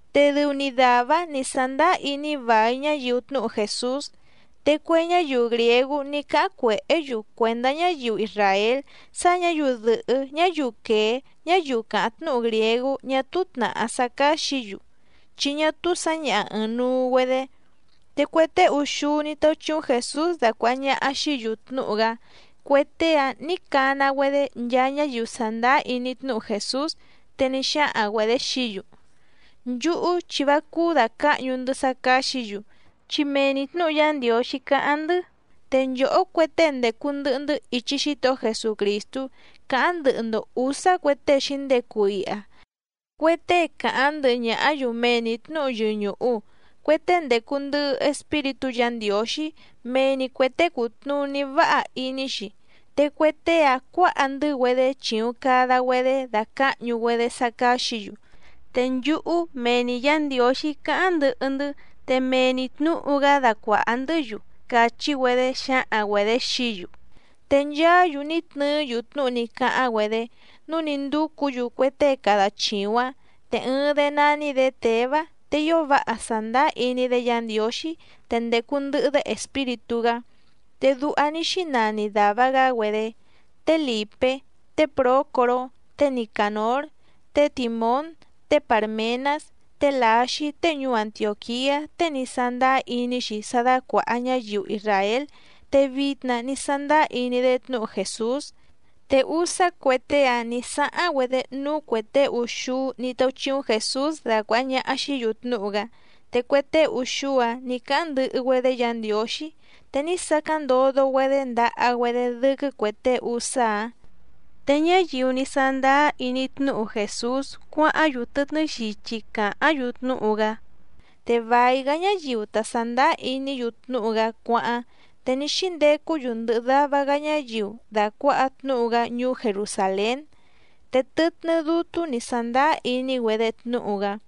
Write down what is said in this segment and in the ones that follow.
Te dɨu‑ni dàvá‑áⁿ nǐ sándáá iní vài ñáyiu tnúhu Jèsús. Te cue ñáyiu grìégú ní cáháⁿ cuèhé‑yu cuèndá ñáyiu isràél, sá ñǎyiu dɨ̀hɨ́ ñáyiu quèé ñáyiu càháⁿ tnúhu grìégú ñá túú tnàhá sá cáxǐ‑yu, chi ñá túú sǎñaha ɨ̀ɨⁿnuu‑güedé. Te cue tée úxúú ní táúchíúⁿ Jèsús dacuàha ñaha xií‑yu tnúhu‑gá, cue tée‑ǎⁿ nǐ cana‑güedé nchaa ñáyiu sàndáá iní tnúhu Jèsús. Te ní xáhaⁿ‑güedě xií‑yu: —Nchúhú chi vá cúú dàcáhñu‑ndɨ́ sá cáxǐ‑yu, chi mee‑ni tnǔhu Yá Ndiǒxí càháⁿ‑ndɨ́. Te nchòhó cue tée ndècu ndɨhɨ‑ndɨ́ ichi Xítohó Jesucrìstú cáháⁿ ndɨhɨ‑ndo ǔsá cue tée xǐndecu iha, cue tée càháⁿ ndɨhɨ ñàhá‑yu mee‑ni tnǔhu yɨñùhu, cue tée ndècu ndɨhɨ Espíritú Yǎ Ndiǒxí, mee‑ni cuè tée cùtnuní váha iní‑xi. Te cue tée‑áⁿ cuǎha‑ndɨ́‑güedé chìuⁿ cada‑güedé dacǎhñu‑güedé sá cáxǐ‑yu. Te nchúhú mee‑ni Yǎ Ndiǒxí cáháⁿ ndɨhɨ‑ndɨ́, te mee‑ni tnǔhu‑gá dacuàha‑ndɨ́‑yu —càchí‑güedé xǎhaⁿ‑güedě xií‑yu. Te nchaá‑yu ní tnɨɨ́‑yu tnúhu ní cáháⁿ‑güedé, núu ní ndúcǔ‑yu cue tée cada chìuⁿ‑áⁿ. Te ɨɨⁿ‑dé nání‑dě Těvá, te ío váha sàndáá iní‑dé Yǎ Ndiǒxí, te ndècu ndɨhɨ‑dé Espíritú‑gá. Te duha ní xínani dàva‑gá‑güedé: té Lìpé, té Prǒcoró, té Nicànór, té Tìmón, té Pàrmenás, té Lǎxí tée ñuú Antiòquiá tée ní sándáá iní‑xi sá dácuàha ñáyiu isràél te vitna ní sándáá iní‑dé tnúhu Jèsús. Te úsá cue tée‑áⁿ nǐ sáháⁿ‑güedé núú cuè tée úxúú ní táúchíúⁿ Jèsús dacuàha ñaha xií‑yu tnúhu‑gá, te cue tée úxúú‑áⁿ nǐ cáháⁿ ndɨhɨ‑güedé Yǎ Ndiǒxí, te ní sacáⁿ ndodo‑güedé ndaha‑güedé dɨ́quɨ́ cuè tée úsá‑áⁿ. Te ñáyiu ní sándáá iní tnúhu Jèsús cuáháⁿ‑yu tɨtnɨ́ xichi càháⁿ‑yu tnúhu‑gá. Te vài‑gá ñáyiu ta sàndáá iní‑yu tnúhu‑gá cuáháⁿ, te ní xíndecú‑yu ndɨhɨ dava‑gá ñáyiu dàcuaha tnúhu‑gá ñuú Jerusàlén. Te tɨtnɨ́ dútú nǐ sándáá iní‑güedé tnúhu‑gá.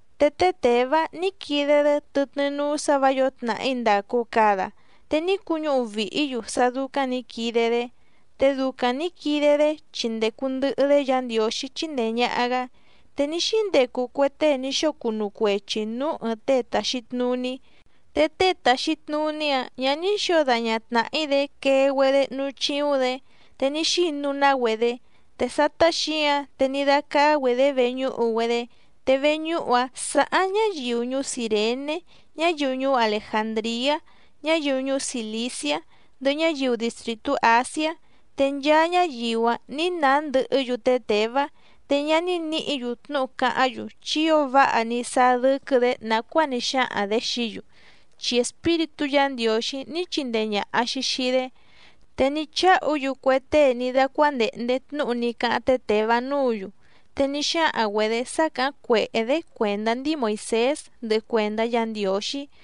Te té Těvá ní quide‑dé tɨtnɨ́ núú sǎ vǎ yǒo tnàhí ndàcu cada, te ní cuñúhu vìhí‑yu sá dúcáⁿ nǐ quide‑dé, te ducaⁿ nǐ quide‑dé chi ndècu ndɨhɨ‑dé Yǎ Ndiǒxí chíndèe ñaha‑gá. Te ní xíndecu cue tée ní xóo cunu cuechi nǔú ɨ̀ɨⁿ tée tàxi tnuní, te tée tàxi tnuní‑áⁿ ñǎ ní xǒo daña tnàhí‑dé quee‑güedé núú chíúⁿ‑dě, te ní xinu‑ná‑güedé. Te sátá xǐǎⁿ, te ní dácáá‑güedě veñúhu‑güedé, te veñúhu‑áⁿ sàháⁿ ñáyiu ñuú Cìrené, ñáyiu ñuú Alejàndriá, ñáyiu ñuú Cìliciá, ndɨhɨ ñáyiu distrìtú Àsiá. Te nchaa ñáyiu‑áⁿ nǐ nàá ndɨhɨ́‑yu té Těvá. Te ñá ní nǐhǐ‑yu tnúhu cáháⁿ‑yu, chi ío váha ní sáá dɨ́quɨ́‑dě nàcuáa ní xáhaⁿ‑dě xií‑yu, chi Espíritú Yǎ Ndiǒxí ní chindee ñàha‑xi xii‑dé. Te ní cháhu‑yu cue tée ní dácuándèhnde tnúhu ní cáháⁿ té Těvá núǔ‑yu. Te ní xáhaⁿ‑güedě sá càháⁿ cuèhé‑dé cuèndá ndíi Moìsés ndɨhɨ cuèndá Yǎ Ndiǒxí.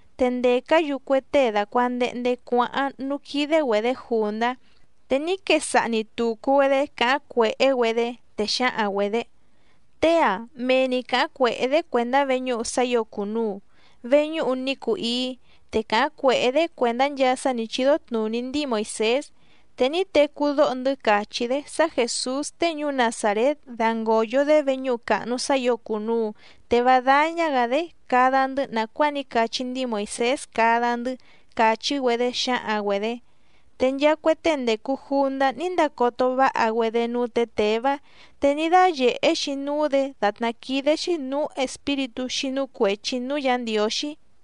Te ndècá‑yu cue tée dàcuandehnde cuáháⁿ núú quídé‑güedě jùndá, te ní quesaha‑ni tùcu‑güedé càháⁿ cuèhé‑güedé, te xǎhaⁿ‑güedě: —Tée‑a mee‑ni càháⁿ cuèhé‑dé cuèndá veñúhu sá ǐo cùnuu, veñúhu ní cuu íí, te càháⁿ cuèhé‑dé cuèndá nchaa sá nǐ chídó tnùní ndíi Moìsés. Te ní tecú dóho‑ndɨ́ càchí‑dé sá Jèsús tée ñuú Nazàrét dangòyo‑dé veñúhu càhnu sá ǐo cùnuu te vá dáñá‑gǎ‑dé cada‑ndɨ́ nàcuáa ní cachí ndíi Moìsés cada‑ndɨ́ —càchí‑güedé xǎhaⁿ‑güedě. Te nchaa cue tée ndècu jundá ní ndacoto váha‑güedé núú tě Těvá. Te ní dáyèhé‑xi núú‑dě dàtná quídé‑xí nǔú espíritú xínú cuèchi núú Yǎ Ndiǒxí.